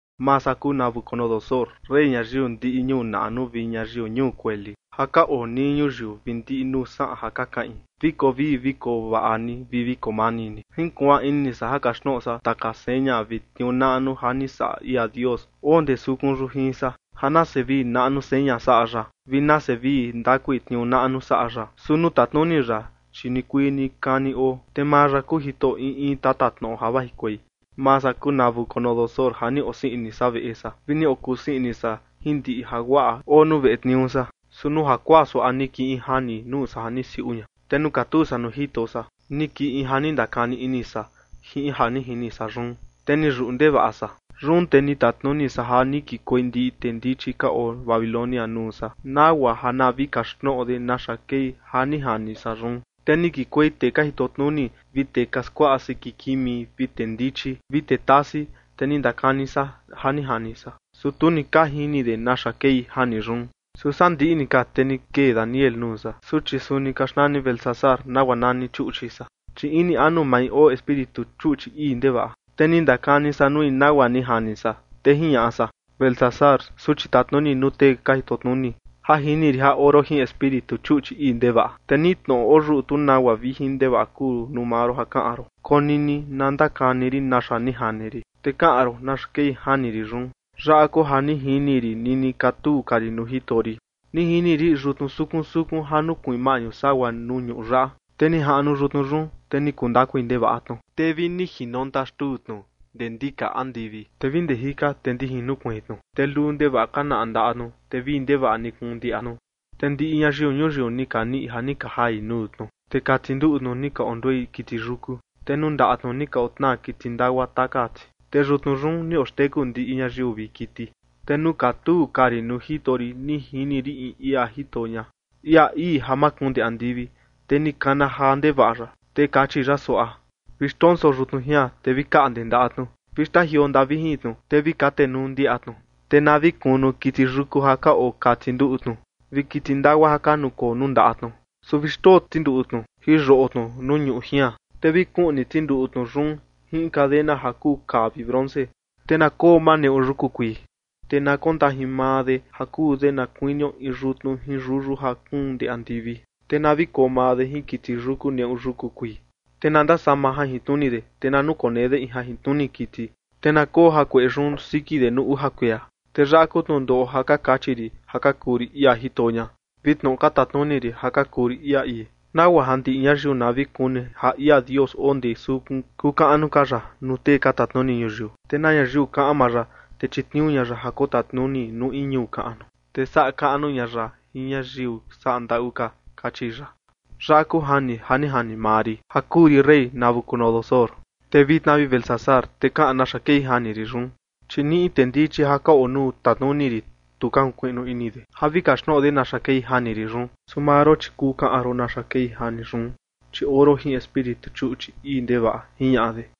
Maa san kuu Nabucodonosor, rey ñayiu ndiꞌi ñuu naꞌnu vi ñayiu ñuu kueli ja ka oo nii ñuyiu vi ndiꞌi nuu saꞌan ja ka kaꞌin. Vi koo vii vi koo vaꞌa ni, vi vi koo mani ni. Jinkuaan ini san ja kaxtnoꞌo san taka seña vi tniuu naꞌnu ja ni saꞌa ia Dios oo ndee sukun yun jin san. Ja nase vii naꞌnu seña saꞌa ya vi nase vii ndakui tniuu naꞌnu saꞌa ya. Su nuu tatnuni ya, chi nikuii nikani oo, te maa ya kuu Jitoꞌo in in tatatnoꞌo ja vajikuei. Maa san kuu Nabucodonosor ja ni osii ini san veꞌe san vi ni okusii ini san jin ndiꞌi jaguaꞌa oo nuu veꞌe tniuu san. Su nuu jakuaa suaꞌa ni kii in jani nuu san ja ni siuꞌu ña, te nuu katuu san nuu jito san ni kii in ja ni ndakani ini san jin ja ni jini san yun, te ni yuꞌu ndevaꞌa san. Yun te ni tatnuni san ja ni kikuei ndiꞌi tee ndichi ka oo Babilonia nuu san, nagua ja na vi kaxtnoꞌo de naxa kei ja ni jani san yun. Te ni kikuei tee ka jitotnuni, vi tee ka skuaꞌa siki kimi, vi tee ndichi, vi tee tasi, te ni ndakani san ja ni jani san, su tu ni ka jini de naxa kei jani yun. Su sandiꞌi ni ka, te ni kee Daniel nuu san, suchi suni ka xnani Beltsasar, nagua nani chuꞌchi san, chi ini anu mai oo espíritu chuꞌchi ii ndevaꞌa, te ni ndakani san nui nagua ni jani san, te jiñaꞌa san: ―Beltsasar, suchi tatnuni nuu tee ka jitotnuni, ja jini rin ja oo ron jin espíritu chuꞌchi ii ndevaꞌa. Te ni in tnoꞌo oyuꞌu, tu nagua vijin ndevaꞌa kuu nuu maa ron ja kaꞌan ron. Konini na ndakani rin naxa ni jani rin, te kaꞌan ron naxa kei jani rin yun. Yaꞌa kuu ja ni jini rin nini katuu ka rin nuu jito rin: Ni jini rin in yutnu sukun sukun ja nukuiin maꞌñu sagua nuu ñuꞌu yaꞌa. Te ni jaꞌnu yutnu yun, te ni kuu ndakui ndevaꞌa tnu, te vi ni jinonta xtuu tnu ndee ndika andivi, te vi ndee jika, te ndijin nukuiin tnu. Te luu ndevaꞌa ka naꞌa ndaꞌa tnu, te vii ndevaꞌa ni kuun ndiaꞌa tnu. Te ndiꞌi ñayiu ñuyiu ni ka niꞌi ja ka jai nuu tnu. Te kati nduꞌu tnu ni ka onduei kiti yuku, te nuu ndaꞌa tnu ni ka otnaa kiti ndagua taka ti, te yutnu yun ni oxteku ndiꞌi ñayiu vi kiti. ’Te nuu katuu ka rin nuu jito rin ni jini rin in ia jito ña, ia ii ja makuun ndee andivi. Te ni kana jaa ndevaꞌa ya, te kachi ya suaꞌa: Vi xndonso yutnu jian, te vi kaꞌnde ndaꞌa tnu. Vi xtajioo ndaꞌa vijin tnu, te vi katenuu ndiaꞌa tnu. Te na vi kunu kiti yuku ja ka oo kati nduꞌu tnu, vi kiti ndagua ja ka nukoo nuu ndaꞌa tnu. Su vi xndoo tinduꞌu tnu jin yoꞌo tnu nuu ñuꞌu jian, te vi kuꞌni tinduꞌu tnu yun jin in cadena ja kuu kaa vi bronce, te na koo maa neꞌu yuku kuii, te na kondajin maa de ja kuu de na kuinio in yutnu jin yuyu ja kuun ndee andivi, te na vi koo maa de jin kiti yuku neꞌu yuku kuii. Te na ndasama jajintnuni de, te na nukonee de in jajintnuni kiti, te na koo jakueꞌe yun siki de nuu uja kuia. Te yaꞌa kuu tnundoꞌo ja ka kachi rin ja ka kuu rin ia jito ña, vi tnoꞌo ka tatnuni rin ja ka kuu rin ia ii, nagua ja ndiꞌi ñayiu na vi kuni ja ia Dios oo ndee sukun kuu kaꞌnu ka ya nuu tee ka tatnuni ñuyiu. Te na ñayiu kaꞌan maa ya, te chitniuu ña ya ja kotatnuni nuu in ñuu kaꞌnu, te saꞌa kaꞌnu ña ya jin ñayiu saꞌa ndaꞌu ka, kachi ya. ―Yaꞌa kuu jani ja ni jani maa rin ja kuu rin rey Nabucodonosor. Te vitna, vi Beltsasar, te kaꞌan naxa kei jani rin yun, chi ni in tee ndichi ja ka oo nuu tatnuni rin, tu ka jinkuiꞌnu ini de ja vi kaxtnoꞌo de naxa kei jani rin yun. Su maa ron, chi kuu kaꞌan ron naxa kei jani yun, chi oo ron jin espíritu chuꞌchi ii ndevaꞌa ―jiñaꞌa de.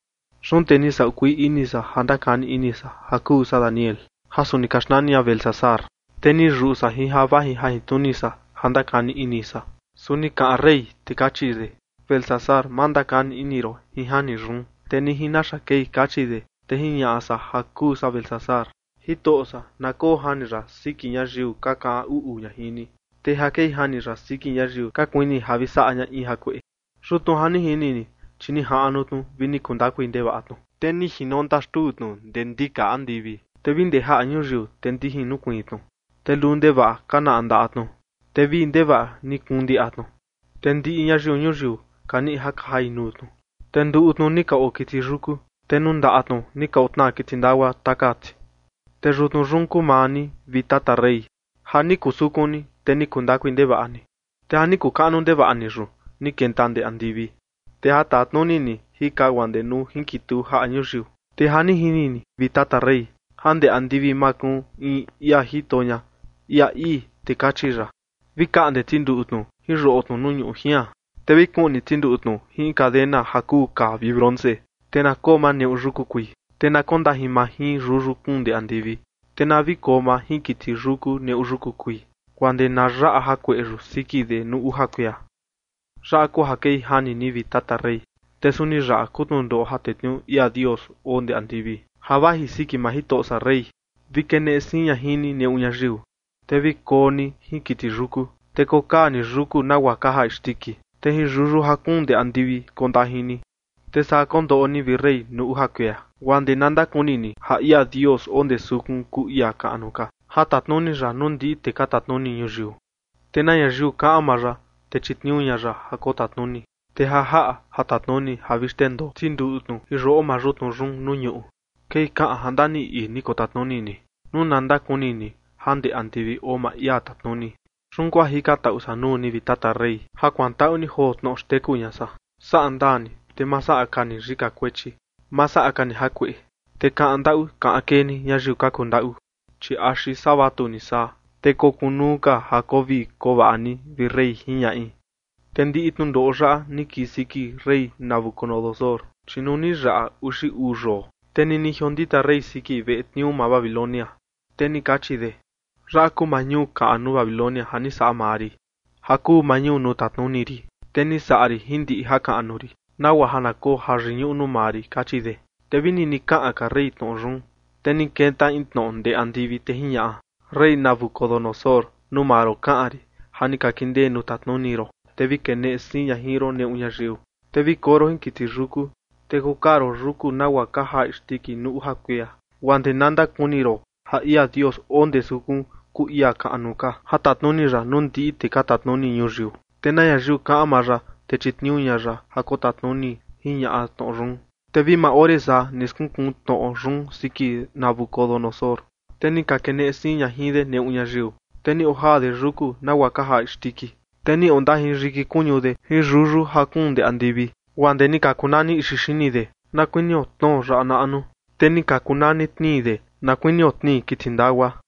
Yun te ni saꞌu kuii ini san ja ndakani ini san, ja kuu san Daniel, ja suni ka xnani ña Beltsasar, te ni yuꞌu san jin ja vaji jajintnuni san ja ndakani ini san. Su ni kaꞌan rey, te kachi de: ―Beltsasar, ma ndakani ini ron jin jani yun, te ni jin naxa kei ―kachi de. Te jiñaꞌa san ja kuu san Beltsasar: ―Jitoꞌo san, na koo jani yaꞌa siki ñayiu ka kaꞌan uꞌu ña jin ni, te ja kei jani yaꞌa siki ñayiu ka kuini ja vi saꞌa ña in jakueꞌe. Yutnu ja ni jini ni, chi nijaꞌnu tnu vi ni kuu ndakui ndevaꞌa tnu, te ni jinonta xtuu tnu ndee ndika andivi, te vi ndee jaꞌa ñuyiu, te ndijin nukuiin tnu. Te luu ndevaꞌa ka naꞌa ndaꞌa tnu, te vii ndevaꞌa ni kuun ndiaꞌa tnu, te ndiꞌi ñayiu ñuyiu ka niꞌi ja ka jai nuu tnu, te nduꞌu tnu ni ka oo kiti yuku, te nuu ndaꞌa tnu ni ka otnaa kiti ndagua taka ti. Te yutnu yun kuu maa ni, vi tata rey, ja ni kuu sukun ni, te ni kuu ndakui ndevaꞌa ni. Te ja ni kuu kaꞌnu ndevaꞌa ni yun ni kenta ndee andivi, te ja tatnuni ni jika guaa ndee nuu jinkituu jaꞌa ñuyiu. Te ja ni jini ni, vi tata rey, ja ndee andivi makuun in ia jito ña, ia ii, te kachi ya: “Vi kaꞌnde tinduꞌu tnu jin yoꞌo tnu nuu ñuꞌu jian, te vi kuꞌni tinduꞌu tnu jin in cadena ja kuu kaa vi bronce, te na koo maa neꞌu yuku kuii, te na kondajin maa jin yuyu kuun ndee andivi, te na vi koo maa jin kiti yuku neꞌu yuku kuii guaa ndee na yaꞌa jakueꞌe yun siki de nuu uja kuia”. ’Yaꞌa kuu ja kei jani ni, vi tata rey, te suni yaꞌa kuu tnundoꞌo ja tetniuu ia Dios oo ndee andivi ja vaji siki maa jitoꞌo san rey: Vi keneꞌe siin ña jin ni neꞌu ñayiu, te vi koo ni jin kiti yuku, te kokaa ni yuku nagua ka jaa isndiki, te jin yuyu ja kuun ndee andivi kondajin ni. Te saa kondoꞌo ni, vi rey, nuu uja kuia, guaa ndee na ndakuni ni ja ia Dios oo ndee sukun kuu ia kaꞌnu ka ja tatnuni ya nuu ndiꞌi tee ka tatnuni ñuyiu. Te na ñayiu kaꞌan maa ya, te chitniuu ña ya ja kotatnuni. Te ja jaꞌa ja tatnuni ja vi xtendoo tinduꞌu tnu jin yoꞌo maa yutnu yun nuu ñuꞌu, kei kaꞌan ja ndaniꞌi ii ni kotatnuni ni nuu na ndakuni ni ja ndee andivi oo maa ia tatnuni. Te yun kuu ja jikantaꞌu san nuu ni, vi tata rey, ja kuantaꞌu ni joo tnoꞌo xteku ña san: Saꞌa ndaa ni, te ma saꞌa ka ni yika kuechi. Ma saꞌa ka ni jakueꞌe, te kaꞌan ndaꞌu kaꞌan kee ni ñayiu ka kundaꞌu. Chi axi saa vatuni saa, te kokunuu ka ja koo vii koo vaꞌa ni, vi rey ―jiñaꞌi. Te ndiꞌi tnundoꞌo yaꞌa ni kii siki rey Nabucodonosor. Chi nuu ni yaꞌa uxi uu yoo, te nini jiondita rey siki veꞌe tniuu maa Babilonia, te ni kachi de: “Yaꞌa kuu maa ñuu kaꞌnu Babilonia ja ni saꞌa maa rin ja kuu maa ñuu nuu tatnuni rin. Te ni saꞌa rin jin ndiꞌi jakaꞌnu rin, nagua ja na koo jayiñuꞌu nuu maa rin”, kachi de. Te vi nini kaꞌan ka rey tnoꞌo yun, te ni kenta in tnoꞌo ndee andivi, te jiñaꞌa: “Rey Nabucodonosor, nuu maa ron kaꞌan rin, ja ni ka kindee nuu tatnuni ron, te vi keneꞌe siin ña jin ron neꞌu ñayiu, te vi koo ron jin kiti yuku, te kokaa ron yuku nagua ka jaa isndiki nuu uja kuia, guaa ndee na ndakuni ron ja ia Dios oo ndee sukun kuu ia kaꞌnu ka ja tatnuni ya nuu ndiꞌi tee ka tatnuni ñuyiu. Te na ñayiu kaꞌan maa ya, te chitniuu ña ya ja kotatnuni”, jiñaꞌa tnoꞌo yun. Te vi maa ore saa, ni skunkuu tnoꞌo yun siki Nabucodonosor, te ni ka keneꞌe siin ña jin de neꞌu ñayiu, te ni ojaa de yuku nagua ka jaa isndiki, te ni ondajin yiki kuñu de jin yuyu ja kuun ndee andivi, guaa ndee ni ka kuu nani ixi xini de, na kuinio tnoo yaꞌa naꞌnu, te ni ka kuu nani tnii de na kuinio tnii kiti ndagua.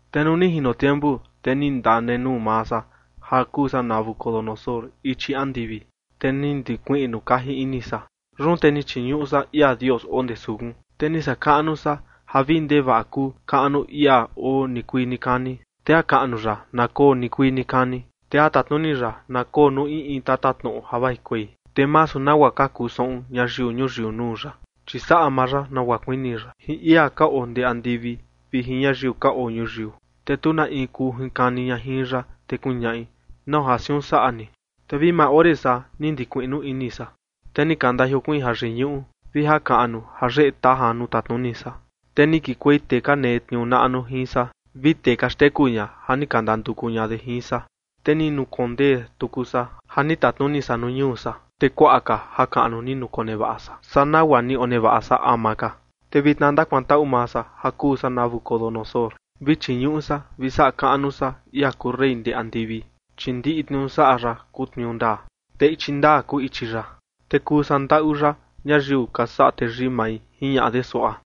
Te nuu ni jino tiempu, te ni ndanenuu maa san ja kuu san Nabucodonosor ichi andivi, te ni ndikuiꞌnu kaji ini san. Yun te ni chiñuꞌu san ia Dios oo ndee sukun, te ni saꞌa kaꞌnu san ja vii ndevaꞌa kuu kaꞌnu ia oo nikuii nikani. Te jakaꞌnu ya na koo nikuii nikani, te ja tatnuni ya na koo nuu in in tatatnoꞌo ja vajikuei. Te masu nagua ka kuu saꞌun ñayiu ñuyiu nuu ya, chi saꞌa maa ya nagua kuini ya, jin ia ka oo ndee andivi vi jin ñayiu ka oo ñuyiu. Te tu na in kuu jinkani ña jin ya, te kuñaꞌi: “¿Nau ja siun saꞌa ni?” Te vi maa ore saa, ni ndikuiꞌnu ini san, te ni ka ndajiokuiin jayiñuꞌu vi jakaꞌnu jayeꞌe tajan nuu tatnuni san. Te ni kikuei tee ka netniuu naꞌnu jin san vi tee ka xteku ña ja ni ka ndanduku ña de jin san. Te ni nukondee tuku san ja ni tatnuni san nuu ñuu san, te kuaꞌa ka jakaꞌnu ni nukonevaꞌa san saa nagua ni onevaꞌa san ama ka. Te vitna ndakuantaꞌu maa san, ja kuu san Nabucodonosor, vi chiñuꞌu san vi saꞌa kaꞌnu san ia kuu rey ndee andivi, chi ndiꞌi tniuu saꞌa ya kuu tniuu ndaa, te ichi ndaa kuu ichi ya, te kuu saꞌa ndaꞌu ya ñayiu ka saꞌa teyii mai ―jiñaꞌa de suaꞌa.